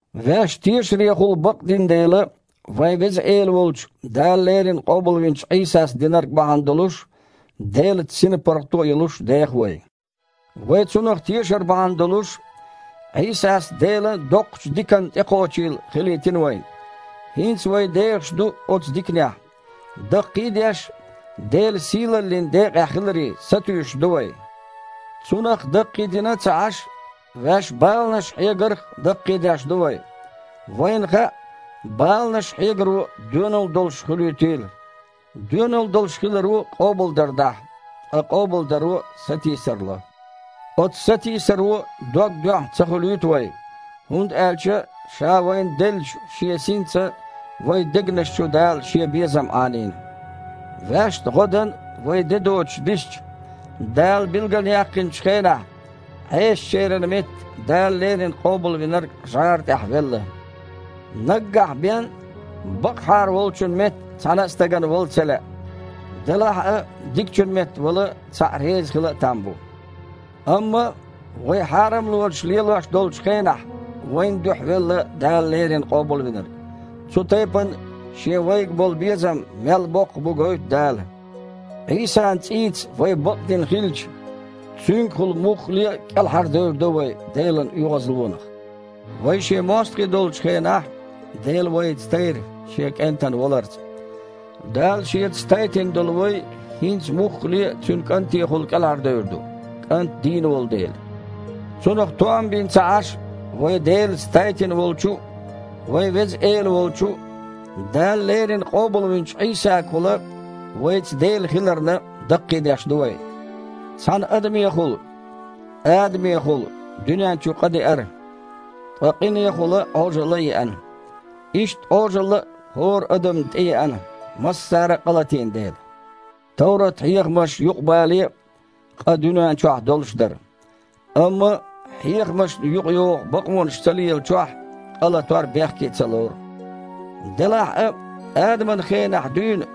Ваьш тешарехула бакъдина дела, вайн Веза Эла волчу, Дала леррина къобалвинчу Іийсас динарг бахьана долуш, Делаца синпаргІато а йолуш деха вай. Вай Цунах тешар бахьана долуш, Іийсас Делан доккхачу диканна тІекхочийла хилийтина вайна. ХІинца вай дехаш ду оцу диканехь. Даккхий а деш, Делан сийлаллин декъехь хиларе сатуьйсуш ду вай. Цунах даккхийдийна а ца Іаш, ваьш баланаш хьегарх а даккхийдеш ду вай. Вайна хаьа, баланаш хьегаро доьналла долуш хуьлуьйтийла. Доьналла долуш хиларо къобалдар дахьа, ткъа къобалдаро сатийсар ло. Оцу сатийсаро дог доьхна ца хуьлуьйту вай, хІунда аьлча Ша вайна деллачу Шен Синца вайн дегнаш чу Дала Шен безам Іанийна. Ваьшна гІо дан вай де доцуш дисича, Дала билгалъяьккхинчу хенахь, Іесачеран метта Дала леррина Къобалвинарг жІара тІехь велла. Наггахь бен, бакъахьара волчун метта цхьана а стагана вала ца лаьа. Делахь а дикачун метта вала цхьаъ реза хила а там бу. Амма, вай хьарамлонаш лелош долчу хенахь, вайн дуьхьа велла Дала леррина Къобалвинарг. Цу тайпана Шен вайга болу безам мел боккха бу гойту Дала. Іийсан цІийца вай бакъдина хилча, Цуьнгахула муххале а кІелхьардевр ду вай Делан оьгІазлонах. Вай Шен мостагІий долчу хенахь Дела вайца тайра Шен КІентан валарца. Дала Шеца тайтина долу вай, хІинца муххале а Цуьнан КІантехула кІелхьардевр ду, КІант дийна волу дела. Цунах тоам бина а ца Іаш, вай Делаца тайтина волчу а, вайн Веза Эла волчу а, Дала леррина къобалвинчу Іийсагахула вайца Дела хиларна, даккхийдеш ду вай. Цхьана адамехула – Адамехула – дуьнен чу къа деара, ткъа къинехула Іожалла а еана. Иштта Іожалла а хІора адамна тІееана, массара а къа латийна дела. Товрат-хьехамаш юкъабале а, къа дуьнен чохь долуш дара. Амма хьехамашна юкъайогІу бакъонаш ца лелачохь къалатор бехке ца лору. Делахь а Адаман хенахь дуьйна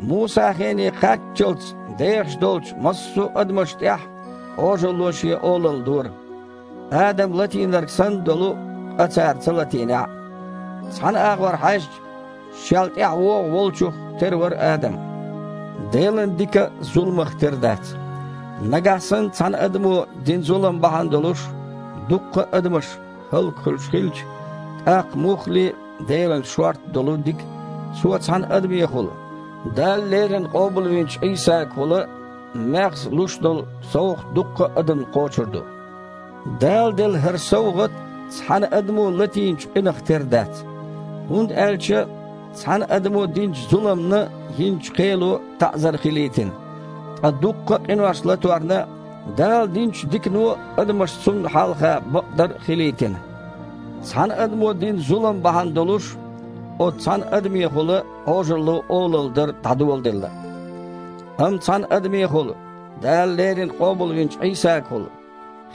Мусан хене кхаччалц дехаш долчу массо а адамашна тІехь Іожалло шен олалла дора, Адама латийнарг санна долу къа цара ца латийнехь а. Цхьана агІор хьаьжча, шел тІаьхьа вогІу Волчух тера вара Адам. Делан дика зуламах тера дац. Нагахь санна, цхьана адамо дина зулам бахьана долуш, дуккха а адамаш хІаллакьхуьлуш хилча, тІаккха муххале а Делан шорта долу дика, Цо цхьана адамехула – Дала леррина къобалвинчу Іийсагахула – маьхза луш долу совгІат дуккха а адамна кхочур ду! Дала делла хІара совгІат цхьана адамо латийначу къинах тера дац. ХІунда аьлча цхьана адамо динчу зуламна йинчу кхело таІзар хилийтина, ткъа дуккха а къинош латорна Дала динчу дикано адамаш Цунна хьалха бакъдар хилийтина. Цхьана адамо дина зулам бахьана долуш, оцу цхьана адамехула Іожалло олалла дар дІадоладелла. Амма цхьана адамехула, Дала леррина къобалвинчу Іийсагахула,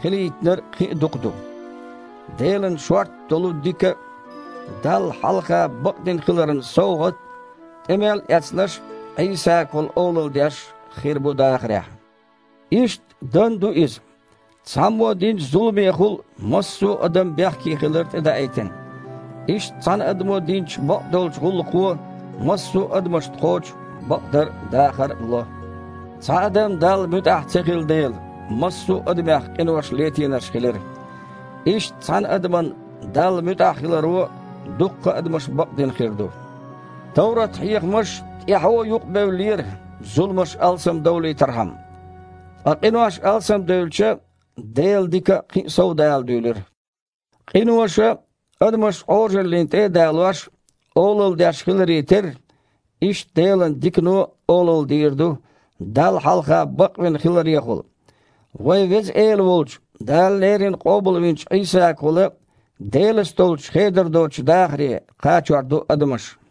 хилийтинарг кхин а дукха ду. Делан шорта долу дика а, Далла хьалха бакъдина хиларан совгІат а тІе мел эцнарш Іийсагахула олалла деш хир бу дахарехь. Иштта дан а ду иза. Цхьаммо динчу зуламехула массо а адам бехкехилар тІедаийтина. Иштта цхьана адамо динчу бакъдолчу гІуллакхо массо а адамашна кхочу бакъдар а, дахар а ло. Цхьа адам Далла муьтІахь ца хилла дела, массо а адамех къинош летийнарш хилира. Иштта цхьана адаман Далла муьтІахь хиларо дуккха а адамаш бакъдина хир ду. Товрат-хьехамаш тІаьхьо юкъабевллера, зуламаш алсамдовлийтархьама. Ткъа къинош алсамдевлча, Делан дика кхин а совдала дуьйлира. Къиноша, адамаш Іожаллина тІе а далош, олалла деш хиларе терра, иштта Делан дикано а олалла дийр ду Далла хьалха бакъвина хиларехула. Вайн Веза Эла волчу, Дала леррина къобалвинчу Іийсагахула Делаца долчу хедар доцучу дахаре кхачор ду адамаш.